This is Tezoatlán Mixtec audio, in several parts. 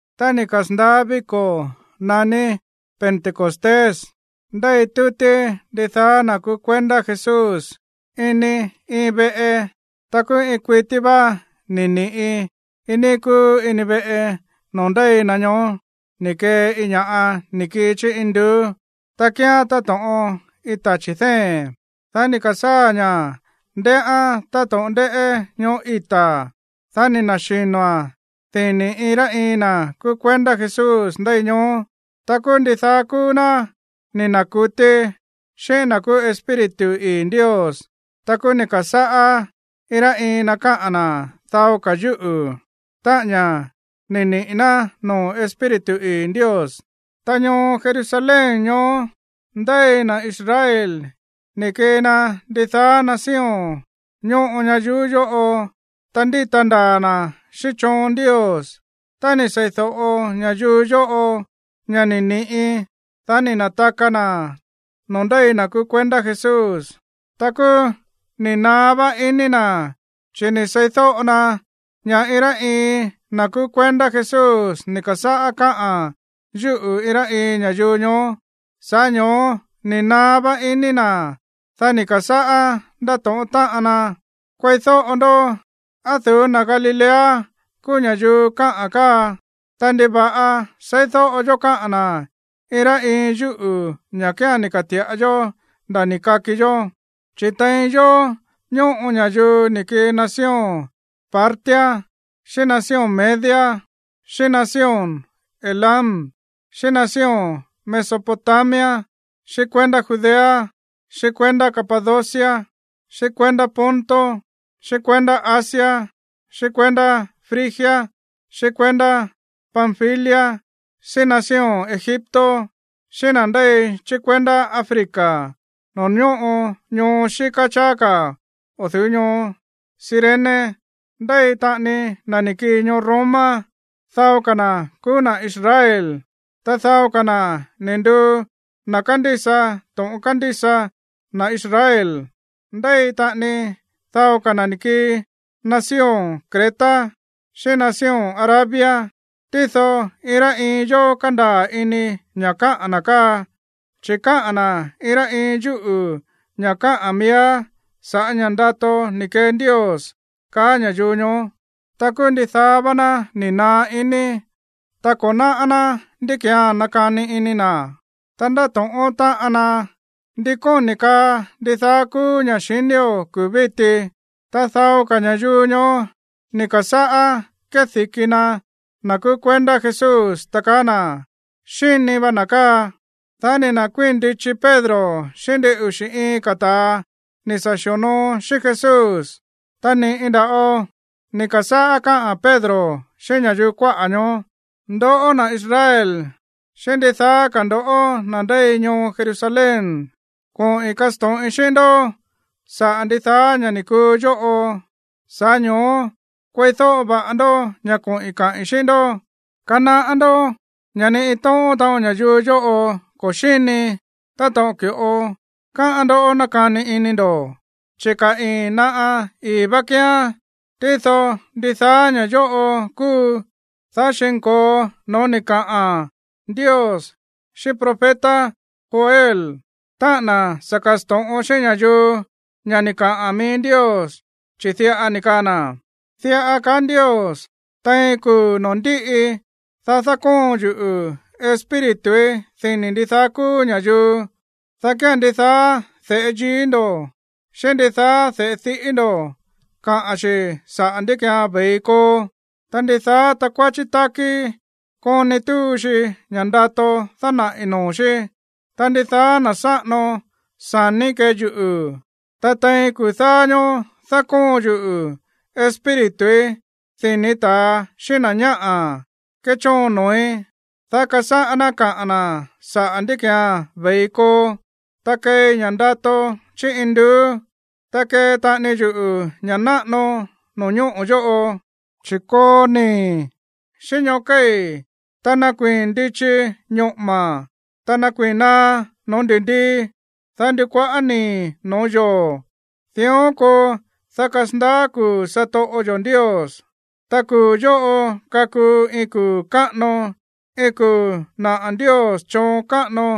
Tá ni̱ kasa̱ndaá víko̱ naní Pentecostés, ndéi tútí ndidaá na̱ kúú kuendá Jesús ini iin veꞌe. Ta kúú iin kuití vá ni̱ ni̱ꞌi iin níí kúú ini veꞌe noo̱ ndéi na ñoó ni̱ kee iin ña̱ꞌa ni̱ kii chí induú, ta kíán táto̱ꞌon iin tachi̱ dée̱n. Dá ni̱ ka̱sáa̱ ña̱ ndéꞌé táto̱ꞌon ndéꞌé ñoꞌó ita̱. Dá ni̱ na̱xino̱a̱n dini̱ iin rá iin na̱ kúú kuendá Jesús ndéi ñoó. Ta kúú ndidaá kúú ná ni̱ na̱kutí xíꞌín na̱ kúú Espíritu ii̱ Ndios. Ta kúú ni̱ ka̱sáꞌá iin rá iin na káꞌa̱n na̱ dao ka̱ yúꞌu̱, táꞌa̱n ña̱ ni̱ niꞌi̱ ná noo̱ Espíritu ii̱ Ndios. Ta ñoo Jerusalén ñoó ndéi na̱ Israel ni̱ kii na ndidaá nación ñóꞌo ñayuú yóꞌo, ta ndíta ndaa̱ na̱ xíꞌín choon Ndios. Tá ni̱ sei̱do̱ꞌo ña̱yuu yóꞌo ña̱ ni̱ ni̱ꞌi, dá ni̱ na̱taka na̱ no̱ó ndéi na̱ kúú kuendá Jesús. Ta kúú ni̱ naá vá iní na̱, chi̱ ni̱ seídóꞌo na ña̱ iin rá iin na̱ kúú kuendá Jesús ni̱ ka̱sáꞌá káꞌa̱n yúꞌu̱ iin rá iin ña̱yuu ñoó. Sa̱ꞌá ño̱ó ni̱ naá vá iní na̱. Dá ni̱ ka̱sáꞌá ndátóꞌón táꞌan ná: ―¡Kueídóꞌo ndó! ¿Á o̱ du̱ú na̱ Galilea kúú ña̱yuu káꞌa̱n káa? Ta, ¿ndiva̱ꞌa seídóꞌo yó káꞌa̱n na̱ iin rá iin yúꞌu̱ ña̱ kía̱n ni̱ ka̱ti̱ꞌa yó nda̱ ni̱ kaki yó? Chi̱ tein yó ñóꞌo ña̱yuu ni̱ kii nación Partia, xíꞌín nación Media, xíꞌín nación Elam, xíꞌín nación Mesopotamia, xíꞌín kuendá Judea, xíꞌín kuendá Capadocia, xíꞌín kuendá Ponto, xíꞌín kuendá Asia, xíꞌín kuendá Frigia, xíꞌín kuendá Panfilia, xíꞌín nación Egipto, xíꞌín na̱ ndéi chí kuendá Africa no̱ó ñóꞌo ñoo xíká cháá ka̱ o̱ du̱ú ñoo Cirene. Ndéi taꞌani na̱ ni̱ kii ñoo Roma. Dao ka̱ na̱ kúú na̱ Israel, ta dao ka̱ na̱ ni̱ nduu na̱ kándísa to̱ꞌon kándísa na̱ Israel. Ndéi taꞌani dao ka̱ na̱ ni̱ kii nación Creta xíꞌín nación Arabia. Tído iin rá iin yó kándaa̱ ini ña̱ káꞌa̱n na̱ káa, chi̱ káꞌa̱n na̱ iin rá iin yúꞌu̱ ña̱ káꞌa̱n miíá sa̱ꞌá ña̱ ndato ni̱ kee Ndios ―kaá ña̱yuu ñoó. Ta kúú ndidaá vá ná ni̱ naá iní. Ta ko̱ náꞌá ná ndí ki̱án nakani ini na̱. Ta ndáto̱ꞌón táꞌan ná: ―¿Ndí kóni̱ kaa ndidaá kúú ña̱ xinío̱ kuu̱ víti? Ta dao ka̱ ña̱yuu ñoó ni̱ ka̱sáꞌá kédi̱ki na̱ na̱ kúú kuendá Jesús, ta kaá na̱: ―Xíni va na̱ káa. Dá ni̱ na̱kuíi̱n ndichi Pedro xíꞌín ndin uxi̱ iin ka̱ ta̱a ni̱ sa̱ xi̱onoo xíꞌín Jesús. Ta ni̱ꞌi nda̱ꞌo ni̱ ka̱sáꞌá káꞌa̱n Pedro xíꞌín ña̱yuu kuáꞌa̱ ñoó: ―Ndoꞌó, na̱ Israel, xíꞌín ndidaá ka̱ ndo̱ꞌó na̱ ndéi ñoo Jerusalén, koꞌi̱n kasto̱ꞌin xíꞌín ndó saꞌa̱ ndidaá ña̱ ni̱ kuu yóꞌo, sa̱ꞌá ño̱ó kueídóꞌo va̱ꞌa ndó ña̱ koꞌi̱n kaꞌi̱n xíꞌín ndó. Kanaꞌá ndó ña̱ ni iin tóꞌón taꞌon ña̱yuu yóꞌo ko̱ xíni, táto̱ꞌon ki̱ꞌo káꞌán ndoꞌó nákani ini ndo̱. Chi̱ ka̱ ii̱n naꞌa ii̱ vá kíán. Tído ndidaá ña̱ yóꞌo kúu, dá xi̱nko̱o no̱ó ni̱ kaꞌa̱n Ndios xíꞌín profeta Joel, táꞌa̱n na̱ sa̱ ka̱sto̱ꞌon xíꞌín ña̱yuu ña̱ ni̱ kaꞌa̱n mií Ndios, chi̱ diꞌa ni̱ kaa na̱: Diꞌa kaá Ndios: Tein kuu̱ noo̱ ndíꞌi, dá dákóon yuꞌu̱ Espírituí dini̱ ndidaá kúú ña̱yuu. Dá kía̱n ndidaá de̱ꞌe yií ndo̱, xíꞌín ndidaá de̱ꞌe diꞌí ndo̱ kaꞌa̱n xi̱ saꞌa̱ ndí ki̱án ve̱i koo. Ta ndidaá takuáchí tákí koni túu xi ña̱ꞌa ndato dánaꞌi̱ noo̱ xí. Ta ndidaá na̱ sáꞌano sa̱ní kee yuꞌu̱. Ta tein kuu̱ dáá ñóó dákóon yuꞌu̱ Espírituí dini̱ ta̱a xíꞌín na̱ ñáꞌa̱ kéchóon noo̱í, dá kasáꞌá ná kaꞌa̱n na̱ saꞌa̱ ndí ki̱án ve̱i koo. Ta keei ña̱ꞌa ndato chí induú, ta kee taꞌani yuꞌu̱ ña̱ náꞌano no̱ñóꞌo̱ yóꞌo, chi̱ koo nii̱, xíꞌín ñóꞌo̱ kéi̱, ta nakuii̱n ndichi ñoꞌo̱ma̱, ta nakuii̱n naá noo̱ ndi̱ndii, ta ndukuaꞌá nii̱ no̱ó yoo̱. Dión koo, dá kasandaá kuu̱ satoꞌo yo̱ Ndios. Ta kuu̱ yóꞌo kakuu iin kuu̱ káꞌano, iin kuu̱ naꞌa̱ Ndios choon káꞌano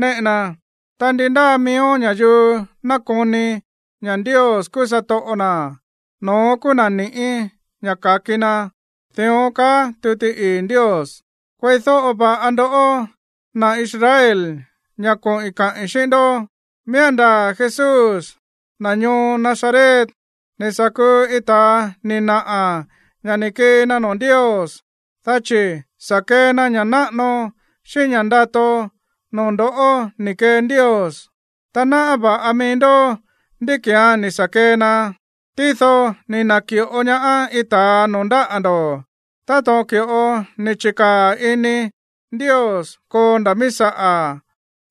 néꞌe na. Ta ndi ndáa miíó ña̱yuu nakoni ña̱ Ndios kúú satoꞌo na̱, no̱ón kúú na̱ ni̱ꞌí ña̱ ka̱ki na. Dión kaá tuti ii̱ Ndios. ’Kueídóꞌo va̱ꞌa ndoꞌó, na̱ Israel, ña̱ koꞌi̱n kaꞌi̱n xíꞌín ndó. Miía̱n ndaa̱ Jesús, na̱ ñoo Nazaret, ni̱ sa̱ kuu iin ta̱a ni̱ naꞌa̱ ña̱ ni̱ kii na noo̱ Ndios, dá chi̱ sa̱ kee na ña̱ náꞌano, xíꞌín ña̱ ndato noo̱ ndo̱ꞌó ni̱ kee Ndios. Ta náꞌá va̱ꞌa mií ndó ndí ki̱án ni̱ sa̱ kee na. Tído ni̱ na̱ki̱ꞌo ñaá iin ta̱a noo̱ ndáꞌa̱ ndo̱, táto̱ꞌon ki̱ꞌo ni̱ chi̱kaa̱ ini Ndios koo nda̱ mií saꞌa̱.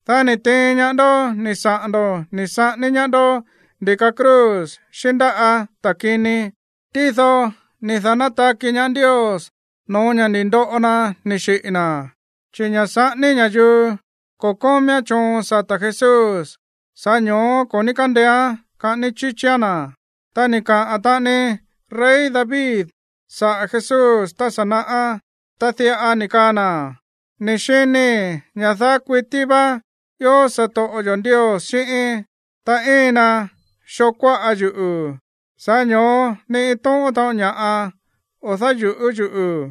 Dá ni̱ tiin ñaá ndoꞌó ni̱ saꞌa̱n ndo̱ ni̱ saꞌání ñaá ndó ndi̱ka cruz xíꞌín ndáꞌa̱ ta̱ kini. Tído ni̱ da̱nátaki ñaá Ndios no̱ó ña̱ ni̱ ndoꞌo na ni̱ xiꞌi̱ na̱. Chi̱ ña̱ saꞌání ña̱yuu ko̱ kómíán choon sata̱ Jesús, sa̱ꞌá ño̱ó ko̱ ní kandeéán kaꞌání chíchíán na̱. ’Ta ni̱ kaꞌa̱n taꞌani rey David saꞌa̱ Jesús tá sa̱ naꞌá. Ta diꞌa ni̱ kaa na̱: Ni̱ xinii̱ ña̱ daá kuití vá ió satoꞌo yo̱ Ndios xíꞌíín. Ta íin na xoo kuáꞌa yuꞌu̱, sa̱ꞌá ño̱ó ni iin tóꞌón taꞌon ña̱ꞌa o̱ dáyu̱ꞌú yuꞌu̱.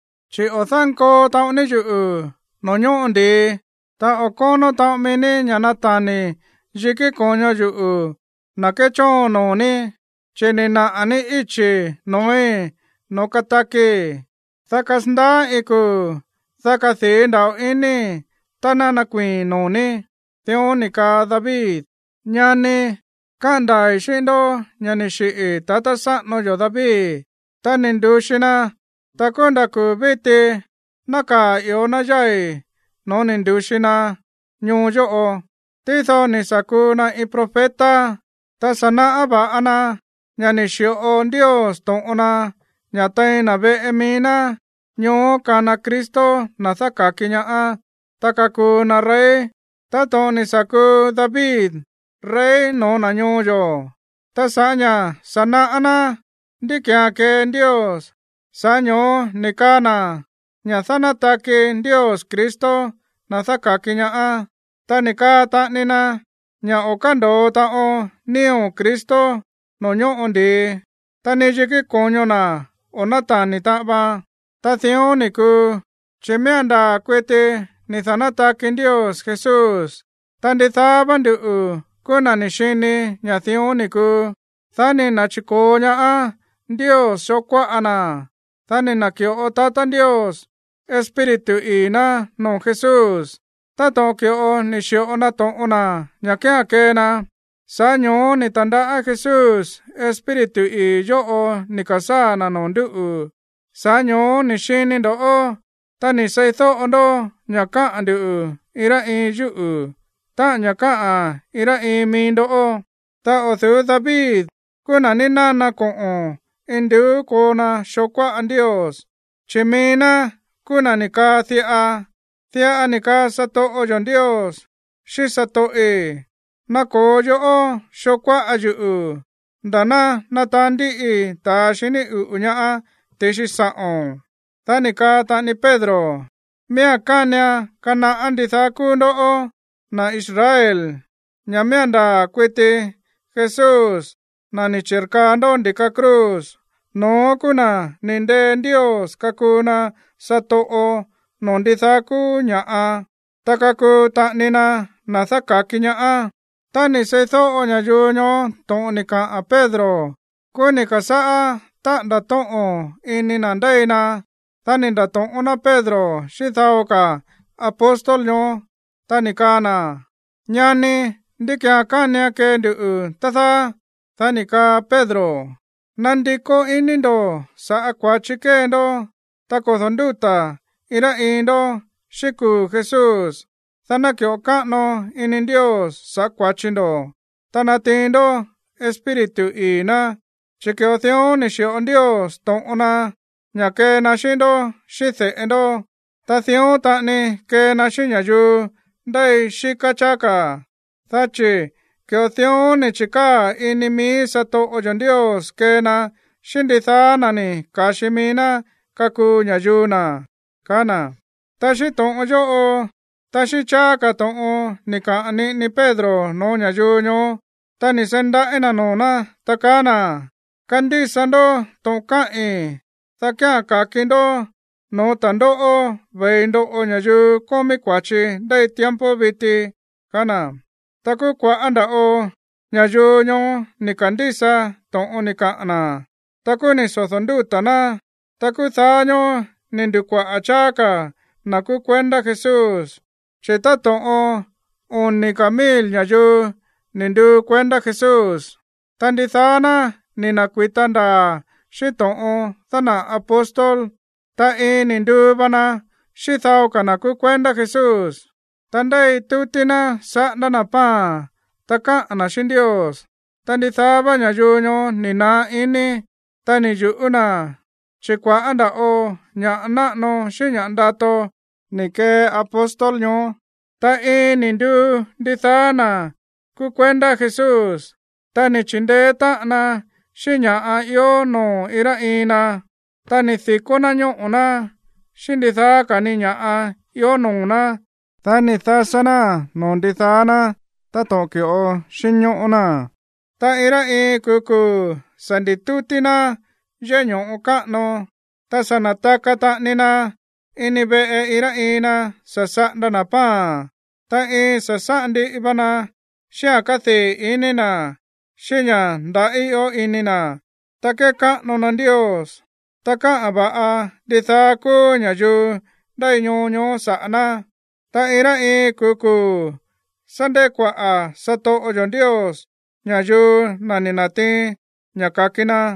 Chi̱ o̱ dánkoo taꞌon ní yuꞌu̱ no̱ó ñóꞌo ndi̱i. Ta o̱ kónó taꞌon mií ní ña̱ natani̱ yikí ko̱ño yuꞌu̱, na̱ kéchóon noo̱ ní. Chi̱ ni̱ naꞌa̱ ní íchi̱ noo̱í noo̱ katakii̱, dá kasandaá iin kuu̱, dá kadii̱ nda̱ꞌo iníi̱ tá ná nakuii̱i̱n noo̱ ní. Dión ni̱ kaa David. ’Ñani, káꞌa̱n ndaa̱i̱ xíꞌín ndó ña̱ ni̱ xiꞌi̱ tatá sáꞌano yo̱ David, ta ni̱ ndu̱xi na. Ta kúú nda̱ kuu̱ víti nákaa̱ i̱íó ná yái̱ no̱ó ni̱ ndu̱xi na ñoo yóꞌo. Tído ni̱ sa̱ kuu na iin profeta, ta sa̱ náꞌá va̱ꞌa na ña̱ ni̱ xi̱ꞌo Ndios to̱ꞌon na ña̱ tein na̱ veꞌe mií ná, ñoó kana Cristo, na̱ dáka̱ki ñaá, ta kakuu na rey, táto̱ꞌon ni̱ sa̱ kuu David rey no̱ó na̱ ñoo yo̱. Ta sa̱ꞌá ña̱ sa̱ náꞌá ná ndí ki̱án kee Ndios, sa̱ꞌá ño̱ó ni̱ kaa na̱ ña̱ dánátaki Ndios Cristo, na̱ dáka̱ki ñaá, ta ni̱ kaa taꞌani na ña̱ o̱ kándo̱o taꞌon nío̱ Cristo noo̱ ñóꞌo ndi̱i, ta ni yikí ko̱ño na̱ o̱ nátani̱ taꞌan vaan. ’Ta dión ni̱ kuu, chi̱ miía̱n ndaa̱ kuiti ni̱ da̱nátaki Ndios Jesús. Ta ndidaá vá nduꞌu̱ kúú na̱ ni̱ xini ña̱ dión ni̱ kuu. Dá ni̱ na̱chi̱ko̱o ñaá Ndios xoo kuáꞌa na̱. Dá ni̱ na̱ki̱ꞌo tatá Ndios Espíritu ii̱ ná noo̱ Jesús, táto̱ꞌon ki̱ꞌo ni̱ xi̱ꞌo na to̱ꞌon na ña̱ kía̱n kee na. Sa̱ꞌá ño̱ó ni̱ ta̱ndaꞌá Jesús Espíritu ii̱ yóꞌo ni̱ ka̱sáa̱ na̱ noo̱ ndúꞌu̱. Sa̱ꞌá ño̱ó ni̱ xini ndo̱ꞌó, ta ni̱ seídóꞌo ndó ña̱ káꞌa̱n nduꞌu̱ iin rá iin yúꞌu̱, táꞌa̱n ña̱ káꞌa̱n iin rá iin mií ndó. ’Ta o̱ du̱ú David kúú na̱ ni̱ nana koꞌo̱n induú koo na xoo kuáꞌa Ndios, chi̱ mií ná kúú na̱ ni̱ kaꞌa̱n diꞌa: Diꞌa ni̱ kaa satoꞌo yo̱ Ndios xíꞌín satoꞌi̱: “Nako̱o yoꞌó xoo kuáꞌa yuꞌu̱, nda̱ ná nataán ndíꞌii ta̱a xiní uꞌu̱ ñaá ti̱xi sa̱ꞌo̱n.” Dá ni̱ kaa taꞌani Pedro: ―Miía̱n kánian kanaꞌá ndidaá kúú ndoꞌó, na̱ Israel, ña̱ miía̱n ndaa̱ kuiti Jesús, na̱ ni̱ chi̱rkaa ndó ndi̱ka cruz, no̱ón kúú na̱ ni̱ ndee Ndios kakuu na satoꞌo noo̱ ndidaá kúú ña̱ꞌa, ta kakuu taꞌani na na̱ dáka̱ki ñaá. Tá ni̱ seídóꞌo ña̱yuu ñoó to̱ꞌon ni̱ kaꞌa̱n Pedro, kúú ni̱ ka̱sáꞌá táꞌa̱nda̱ tóꞌo̱n ini na̱ ndéi na. Dá ni̱ nda̱to̱ꞌón ná Pedro xíꞌín dao ka̱ apóstol ñoó, ta ni̱ kaa na̱: ―Ñani, ¿ndí ki̱án kánian kee nduꞌu̱, tá dáá? Dá ni̱ kaa Pedro: ―Nandikó iní ndo̱ saꞌa̱ kua̱chi kée ndó, ta kodo̱ ndúta̱ iin rá iin ndó xíꞌín kuu̱ Jesús. Dá ná ki̱ꞌo káꞌano ini Ndios sa̱ꞌá kua̱chi ndo̱, dá natiin ndó Espíritu ii̱ ná. Chi̱ ki̱ꞌo dión ni̱ xi̱ꞌo Ndios to̱ꞌon na ña̱ kee na xíꞌín ndoꞌó xíꞌín de̱ꞌe ndó. Ta dión taꞌani kee na xíꞌín ña̱yuu ndéi xíká cháá ka̱, dá chi̱ ki̱ꞌo dión ni̱ chi̱kaa̱ ini mií satoꞌo yo̱ Ndios kee na xíꞌín ndidaá na̱ ni̱ ka̱xi mií ná kakuu ña̱yuu na̱ ―kaá na̱. Ta xíꞌín to̱ꞌon yóꞌo, ta xíꞌín cháá ka̱ to̱ꞌon ni̱ kaꞌa̱n niꞌini Pedro no̱ó ña̱yuu ñoó, ta ni̱ seí ndaꞌí na̱ noo̱ ná, ta kaá na̱: ―Kandísa ndó to̱ꞌon káꞌi̱n, dá kía̱n ka̱ki ndó no̱ó ta̱ndóꞌó ve̱i ndoꞌo ña̱yuu kómí kua̱chi ndéi tiempo viti ―kaá na̱. Ta kúú kua̱ꞌá nda̱ꞌo ña̱yuu ñoó ni̱ ka̱ndísa to̱ꞌon ni̱ kaꞌa̱n na̱. Ta kúú ni̱ sodo̱ ndúta̱ ná. Ta kuu̱ dáá ñóó ni̱ ndu̱kuaꞌa̱ cháá ka̱ na̱ kúú kuendá Jesús, chi̱ táto̱ꞌon oni̱ ka̱ mil ña̱yuu ni̱ nduu kuendá Jesús. Ta ndidaá ná ni̱ na̱kui̱ta ndaa̱ xíꞌín to̱ꞌon dánaꞌa̱ apóstol. Ta iin ni̱ nduu va na xíꞌín dao ka̱ na̱ kúú kuendá Jesús. Ta ndéi tútí ná saꞌándá na̱ pan, ta káꞌa̱n na̱ xíꞌín Ndios. Ta ndidaá vá ña̱yuu ñoó ni̱ naá iní, ta ni̱ yu̱ꞌú na̱, chi̱ kua̱ꞌá nda̱ꞌo ña̱ꞌa náꞌano xíꞌín ña̱ ndato ni̱ kee apóstol ñoó. Ta iin ni̱ nduu ndidaá na̱ kúú kuendá Jesús. Ta ni̱ chi̱ndeé táꞌan na xíꞌín ña̱ꞌa ió noo̱ iin rá iin na. Ta ni̱ di̱kó ná ñóꞌo̱ ná, xíꞌín ndidaá ka̱ ni ña̱ꞌa ió noo̱ ná, dá ni̱ dasá náa̱n noo̱ ndidaá ná táto̱ꞌon ki̱ꞌo xínñóꞌó ná. Ta iin rá iin kuu̱ kuu̱ sa̱ ndi̱tútí ná yéꞌé ño̱ꞌo káꞌano. Ta sa̱ na̱taka taꞌani na ini veꞌe iin rá iin na sa̱ saꞌanda na̱ pan, ta iin sásáꞌan ndiꞌi va na xíꞌa̱n kádii̱ iní na̱, xíꞌín ña̱ nda̱ꞌí ió ini na̱. Ta kékáꞌano na Ndios. Ta káꞌa̱n va̱ꞌa ndidaá kúú ña̱yuu ndéi ñoo ñoó saꞌa̱ ná. Ta iin rá iin kuu̱ kuu̱ sá ndekuaꞌa̱ satoꞌo yo̱ Ndios ña̱yuu, na̱ ni̱ na̱tiin ña̱ ka̱ki na.